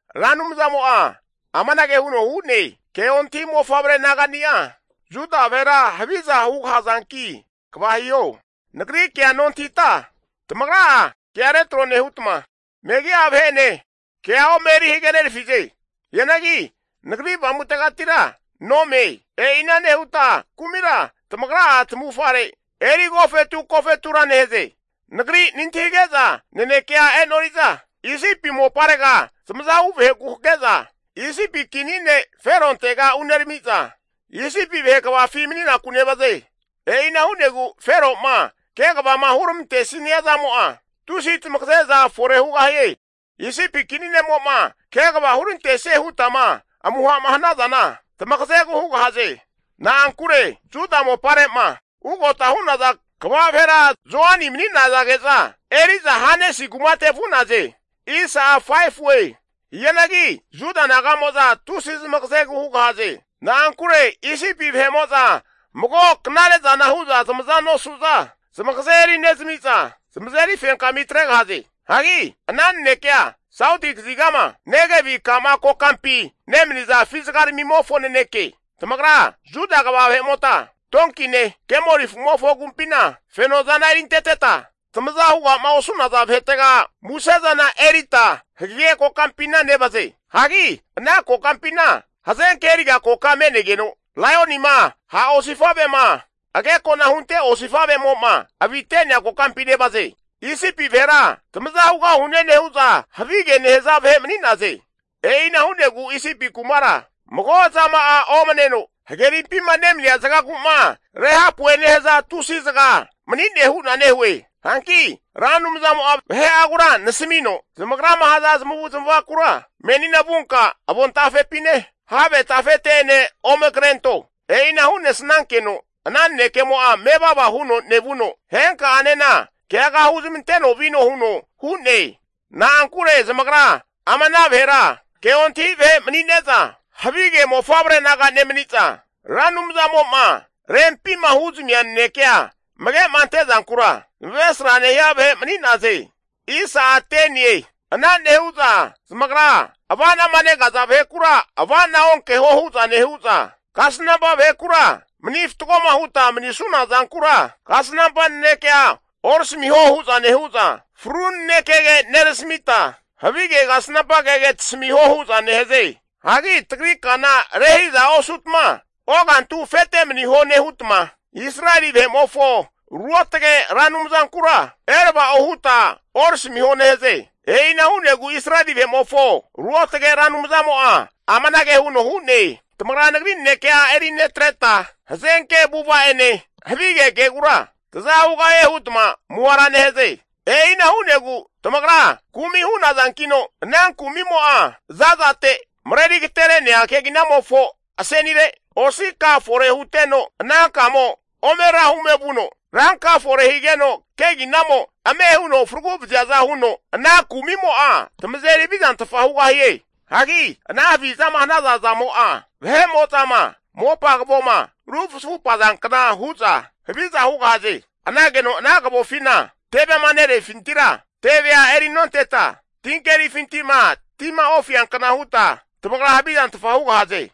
Ra Anumzamo'a amanage huno hu'ne, ke ontahi mofavre nagani'a Juda vahera haviza hugahazanki kva hiho. Nagri kea nontahita tamagra'a kea retro nehutma, megi'a vahe'ene kea ome eri hagenerafize. Hianagi Nagri Avamutegatira nome. E'ina nehuta kumira tamagra'a tamavufare eri agofetu agofetu nehaze. Nagrira nantahige'za nanekea e'nori'za, Isipi moparega zamazahu vaheku hake'za Isipi kini ne' Ferontega unerami'za, Isipi vahe kvafi mani'naku nevaze. E'ina hu'negu Fero'ma kegavama huramantesnia zamo'a, tusi tamagaze'za fore hugahie. Isipi kini ne'mo'ma kegava hurantesie hutama amuha'ma hanazana tamagazegu hugahaze. Na'ankure Juda mopare'ma ugota hu'naza kva vahera Zoani mani'nazage'za, eri'za vahe'amo'za Hanesi kumate vu'naze. Hianagi Juda naga'moza tusi zamagazegu hugahaze. Na'ankure Isipi vahe'mo'za mago knare zana hu'za zamaza nosu'za, zamagaze eri nezami'za zamazeri fenkami atregahaze. Hagi ama nanekea sauti kazigama Negevi ka'ma kokampi nemaniza afizagaramimofo naneke. Tamagra Juda kva vahe'mota donkine kemoli afu'mofo agumpina fenozana erinteteta, tamaza huga'ma osu'naza vahetega musezana erita hagege kokampina nevaze. Hagi ana kokampina hazenke eriga koka me'negeno, laionima, ha' osifa'vema, agekona hunte osifavemo'ma avite'nea kokampi nevaze. Isipi vahera tamaza hugahune nehu'za, havige nehaze vahe mani'naze. E'ina hu'negu Isipi kumakura, mago zama'a omaneno, hagerimpima nemania zagagu'ma Rehapu'e nehaza tusi zaga mani'ne hu'na nehue. Hanki Ra Anumzamo'a vahe'agura nasamino, Zamagrama haza zamavu zamavakura menina vunka avontafepine, have tafete'ene ome krento. E'ina hu'nesnankeno ana nanekemo'a mevava huno nevuno, henka'anena keaga huzmanteno vino huno hu'ne. Na'ankure zamagra ama ana vahera ke ontahi vahe mani'ne'za, havige mofavre naga nemani'za, Ra Anumzamo'ma rempima huzamia nanekea amage'ma ante'zankura zamavesra nehia vahe mani'naze. Ana nehu'za zamagra ava'nama negaza vahekura ava'na onkeho hu'za nehu'za, kasnampa vahekura mani fatgoma huta manisuna zankura kasnampa nanekea orasamiho huza nehu'za fru nanekege nerasamita, havige kasnampa kege tasamiho huza nehaze. Hagi tagri kana rehiza osutma, ogantu afete maniho nehutma, Israeli vahe'mofo Ruotage Ra Anumzankura erava'o huta orasamiho nehaze. E'ina hu'negu Israeli vahe'mofo Ruotage Ra Anumzamo'a amanage huno hu'ne, Tamagra Nagri nanekea eri netreta, hazenke avu'ava'ene havige kegura taza hugahie hutma amuhara nehaze. E'ina hu'negu tamagra kumi hu'nazankino, ana kumi'mo'a zazate mareri agatere'nea keginamofo asenire osi ka fore huteno, ana kamo omera hume vuno ranka fore higeno keginamo ame huno faragu vaziaza huno, ana kumimo'a tamazeri havizantfa hugahie. Hagi ana havizama hanaza zamo'a, vahe'mo'zama mopa kavoma rufuzafupea kna hu'za haviza hugahaze. Hanageno ana kavofima tevema nerefintira tevea erinonteta, tinkerifintima tima ofiankna huta tamagra havizantfa hugahaze.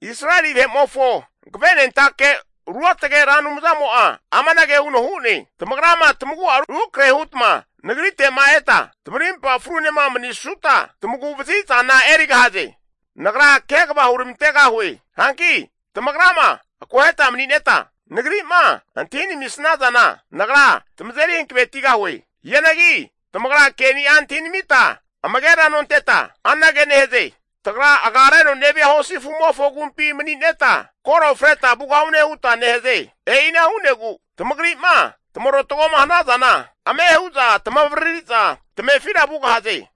Israeli vahe'mofo Hankavenentake Ruotage Ra Anumzamo'a amanage huno hu'ne, Tamagrama tamagu'a rukrahe hutma nagrite'ma eta tamarimpa frunema mani'sanuta tamaguvazi zana erigahaze. Nagra kegava huramantegahue. Hanki tamagrama akoheta mani'neta Nagri'ma antahi namisnazana, Nagra tamazeri hankavetigahue. Hianagi tamagra ke'ni'a antahinamita amagera nonteta, anage nehaze, Tagra agareno nevia hosi afu'mofo agumpi mani'neta, koro freta vugahune huta nehaze. E'ina hu'negu tamagri'ma tamarotago'ma hanazana ame hu'za tamavaririza tamefira vugahaze.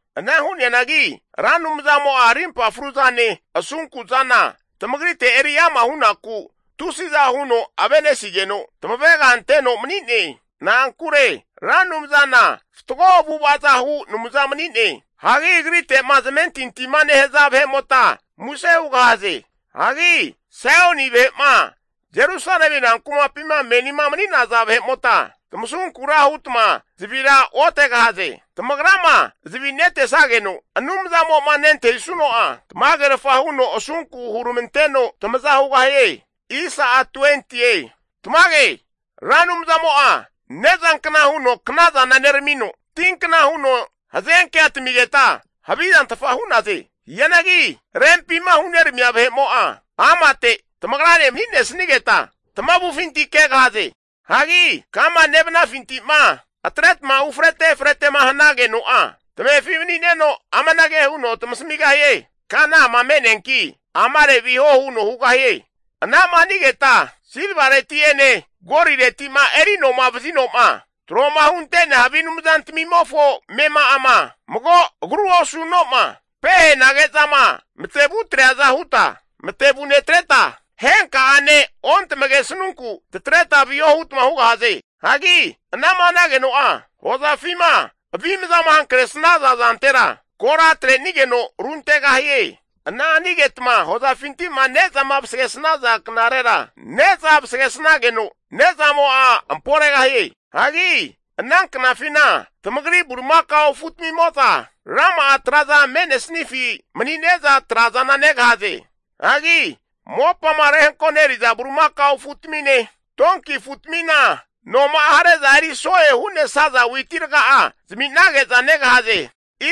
Ana hu'neanagi Ra Anumzamo'a arimpa fruzane asunku zana tamagrite eri ama hunaku tusiza huno avenesigeno tamavega anteno mani'ne. Na'ankure Ra Anumzana fatgo avu'avaza hu Anumza mani'ne. Hagi agrite'ma zamentintima nehaza vahemota muse hugahaze. Hagi Saioni vahe'ma Jerusalemi rankumapima menima mani'naza vahe'mota, tamasunkura hutma zavira otegahaze. Tamagrama zavi netesageno Anumzamo'ma nentahisuno'a tamagerfa huno asunku huramanteno tamaza hugahie. Tamage Ra Anumzamo'a nezankna huno knazana neramino, tinkna huno hazenkea tamigeta havizantfa hu'naze. Hianagi rempima huneramia vahe'mo'a amate tamagrane mani'nesanigeta, tamavufinti kegahaze. Hagi kama nevanafinti'ma atretma ufrete efrete'ma nehanageno'a, tamefi mani'neno amanage huno tamasamigahie. Kana ama me'neanki, amare viho huno hugahie. Anama hanigeta silvareti'ene golireti'ma eri anoma vazinoma tro'ma hunte'nea havi anumzantamimofo amema'ama, mago agru osu'noma pehanagezama matevu atreaza huta matevu netreta, henka'ane ontamagesnunku tatreta viho hutma hugahaze. Hagi anama hanageno'a, hozafima avimzama hankresnaza zantera, kora atrenigeno runtegahie. Ana hanigetma hozafinti'ma ne'zama vasagesnaza knarera, ne'zana vasagesnageno ne'zamo'a amporegahie. Hagi ana knafina tamagri bulimakao afutamimo'za rama'a traza me'nesnifi mani'ne'za trazana negahaze. Hagi mopama rehankoneriza bulimakao afutamine donki afutamina anoma'a hare'za eri so'e hu'nesaza witi raga'a zami'nage'za negahaze.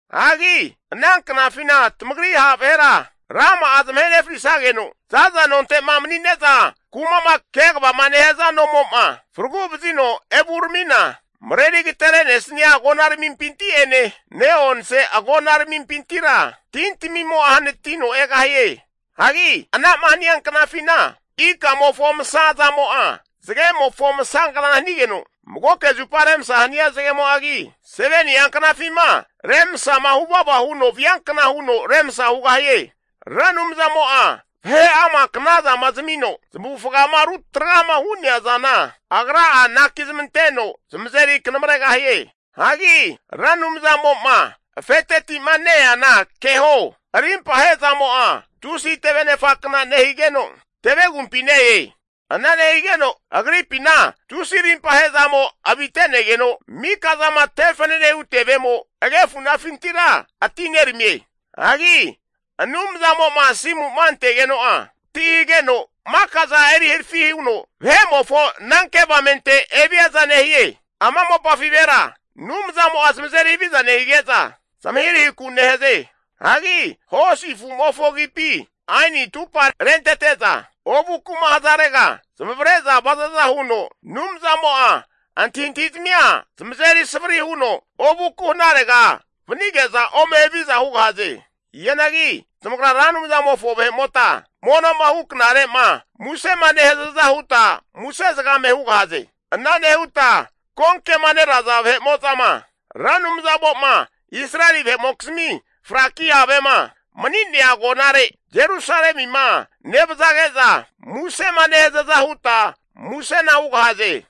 Hagi ana knafina tamagri ha' vahera rama'a zamahe nefrisageno, za'za nonte'ma mani'ne'za kuma'ma kegavama nehaza nomo'ma fragu vazino evuneramina, mareri agatere'nesania agonaramimpinti'ene ne'onse agonaramimpintira tintamimo hanatino egahie. Hagi ana'ma hania knafina, ikamofo masa zamo'a zagemofo masagna hanigeno, magoke zupa remsa hania zagemo'agi, 7ni'a knafima remsama huvava huno viankna huno remsa hugahie. Ra Anumzamo'a vahe'ama knazama zamino zamavufagama ru tragama hu'nea zana, Agra'a anaki zmanteno zamazeri kanamregahie. Hagi Ra Anumzamo'ma afeteti'ma neana keho. Rimpa ahezamo'a tusi tevenefakna nehigeno, tevegumpi ne-e. Ana nehigeno Agripina tusi rimpa ahezamo avinetegeno, mika zama te fananehu tevemo agefunafintira atineramie. Hagi Anumzamo'ma asimu'ma antegeno'a, ti hageno makaza eri harafi huno vahe'mofo ananke avamente eviaza nehie. Ama mopafi vahera Anumzamo'a zamazeri haviza nehige'za, zamahirahiku nehaze. Hagi hosi afumofo agipi aini atupa rentete'za, ovuku'ma hazarega zamavare'za vazaza huno, Anumzamo'a antahi antahi'zamia zamazeri savri huno ovuku hanarega vanige'za ome haviza hugahaze. Hianagi tamagra Ra Anumzamofo vahe'mota mono'ma hu knare'ma musema nehazaza huta muse zagame hugahaze. Ana nehuta konkema neraza vahe'mo'zama Ra Anumzamo'ma Israeli vahe'mokizmi fraki havema mani'nea agonare Jerusalemima nevazage'za musema nehazaza huta musena hugahaze.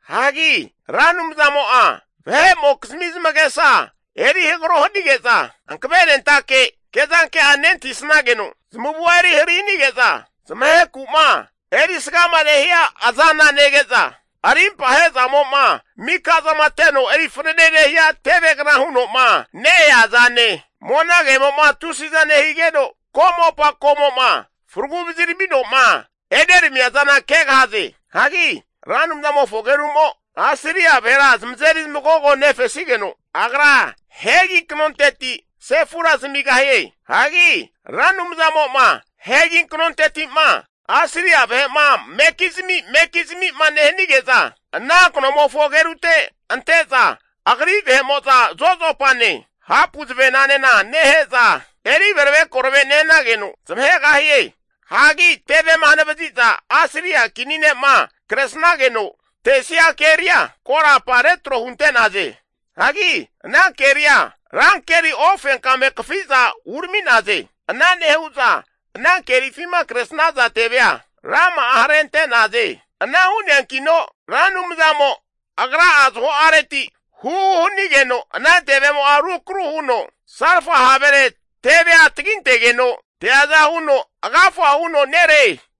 Hagi Ra Anumzamo'a vahe'mokizmi zamagesa eri hagaro hanige'za, hankavenentake ke'zanke'a nentahisnageno, zamavua eri hari hanige'za zamaheku'ma erisgama nehia azana nege'za, arimpa he'zamo'ma mika'za teno eri fanane nehia tevegna huno'ma ne-ea zane monagemo'ma tusiza nehigeno komopa komo'ma faragu vaziramino'ma eneramia zana kegahaze. Hagi Ra Anumzamofo ageru'mo Asiria vahera zamazeri zamagogo nefesigeno, Agra hegi kanonteti sefura zamigahie. Hagi Ra Anumzamo'ma hegi kanonteti'ma Asiria vahe'ma mekizami mekizamima nehanige'za, ana kanomofo agerute ante'za agri vahe'mo'za zozopane hapu zavenane nehe'za eri verave korave nehanageno zamahegahie. Hagi tevema hanavazi'za Asiria kini ne'ma kresnageno tesia keria, korapa retro hunte'naze. Hagi ana keria rankeri ofenkame kafiza urami'naze. Ana nehu'za ana kerifima kresnaza tevea rama'a harente'naze. Ana hu'neankino Ra Anumzamo Agra'a zaho'areti huhu hanigeno ana tevemo'a rukaru huno salfa havere tevea tagintegeno teaza huno agafa huno tegahie.